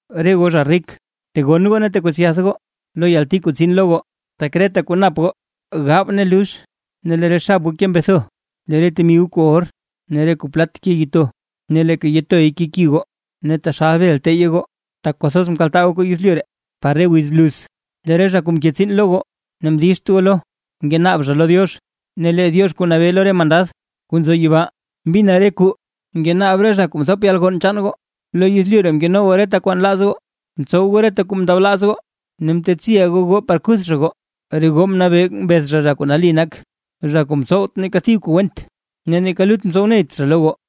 Re goo zha rik. Tegonn goo ne tekwetsyath goo lo yalti kuu tsin lo goo. Tak reta kuu nap goo gaab ne lux, ne lee re xab goo ke mbetho. Lee re temi goo kuu or ne kuu plat ke yitoy ne leeka yitoy keki goo, ne taxal bel teyye goo. Tak kwathoz mkaltaa goo kuu yezlyu ree par re wiz bluz. Lee re zha kuu mke tsiin lo goo ne mdizht goo lo, ngenaab zha lo Diox; ne lee Diox kuu nabee lo re mandad kuu nzo yibaa mbina re kuu ngenaab re zha kuu mthop yalgonn chaan goo. Lo yezlyu ree mkeno goo reta kuu nlaaz goo, mtsow goo reta kuu mndablaaz goo ne mtetsiʼa goo goo par kuth zha goo. Re goo mnabee mbeth zha, zha kuu nali nak, zha kuu mtsowt neeka thib kuu went, ne neeka lut mtsow neyt zha lo goo.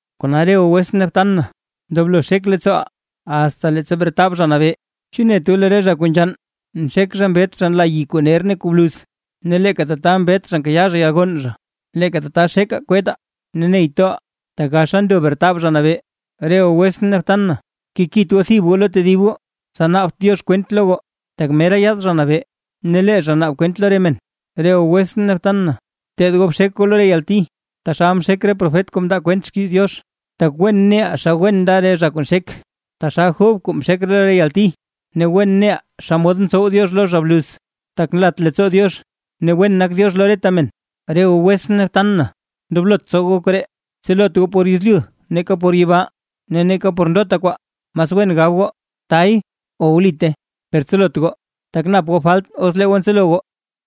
Kona re goo wetsʼn ne btan na ndoblo xek leettsooʼaa, asta leettsa bretab Zha Nabee. ¿Chu net goo lee re zha kuu nzhann nxek zha mbet zha nla yi kuu ner ne kuu bluz? Ne leeka tata mbet zha nkayaa zha yalgonn zha. Leeka tata xekaa kwettaa ne ney toʼaa, tak gaxa ndo bretab Zha Nabee. Re goo wetsʼn ne btan na, kekit goo thib goo lo tedib goo, tsa naabt Diox kwent lo goo, tak mera yaad Zha Nabee ne lee zha naab kwent lo re men. Re goo wetsʼn ne btan na, bteed goo bxek goo lo re yalti taxal mxek re profet kuu mndaa kwent xkiiz Diox. Tak wen neʼaa xa wen nda re zha kuu nxek, taxal Job kuu mxek lo re yalti, ne wen neʼaa xomod mtsow Diox lo zha bluz; tak nlat leettsoo Diox ne wen nak Diox lo reta men. Re goo wetsʼn ne btan na, ndoblot tsow goo koree, tselot goo por yezlyu neeka por yibaa, ne neeka por ndota kwaa. Mas wen gab goo: “Tay” o “Wlite”. Per tselot goo, tak nap goo falt os lee goo tselo goo.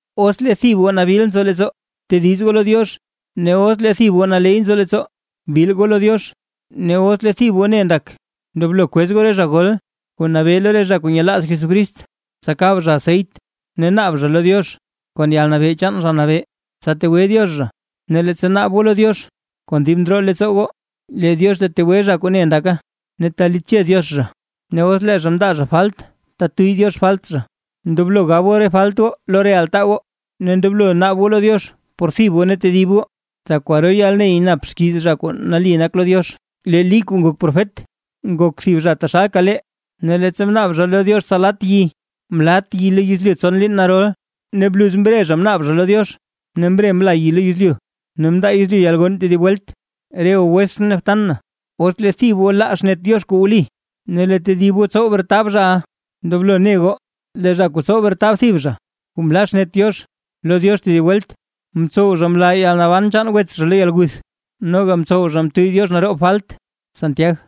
Os lee thib goo nabil nzo leettsoo, btediz goo lo Diox. Ne os lee thib goo naley nzo leettsoo, bil goo lo Diox. Ne os lee thib goo ne ndak, ndoblo kwez goo re zha gol kuu nabee lo re zha kuu nyelaaz Jesucrist, tsa kaab zha aseyt ne naab zha lo Diox kon yalnabee chaan Zha Nabee, tsa tegwe Diox zha. Ne leettsa naab goo lo Diox kon dib ndroo leettsoo goo, lee Diox tetegwe zha kuu ne ndaka, ne talitche Diox zha, ne os lee zha mndaa zha falt tetuyy Diox falt zha. Ndoblo gab goo re falt goo lo re altaa goo, ne ndoblo naab goo lo Diox por thib goo ne tedib goo. Tak kwaro yalney nap xkiiz zha kuu nali nak lo Diox. Lee Lí kuu ngok profet, ngok thib zha taxalka lee; ne leettsa mnaab zha lo Diox tsa lat yi, mlat yi lo yezlyu tson liin narol. Ne bluz mre zha mnaab zha lo Diox, ne mre mla yi lo yezlyu, ne mndaa yezlyu yalgonn tedib welt. Re goo wetsʼn ne btan na, os lee thib goo laa xnet Diox kuu wli, ne lee tedib goo tsow retab zhaʼa, ndoblo ne goo lee zha kuu tsow retab thib zha kuu mlaa xnet Diox lo Diox tedib welt, mtsow zha mlaa yalnaban chaan wets zha lo yalguth, noga mtsow zha mtuyy Diox naroob falt. Santiag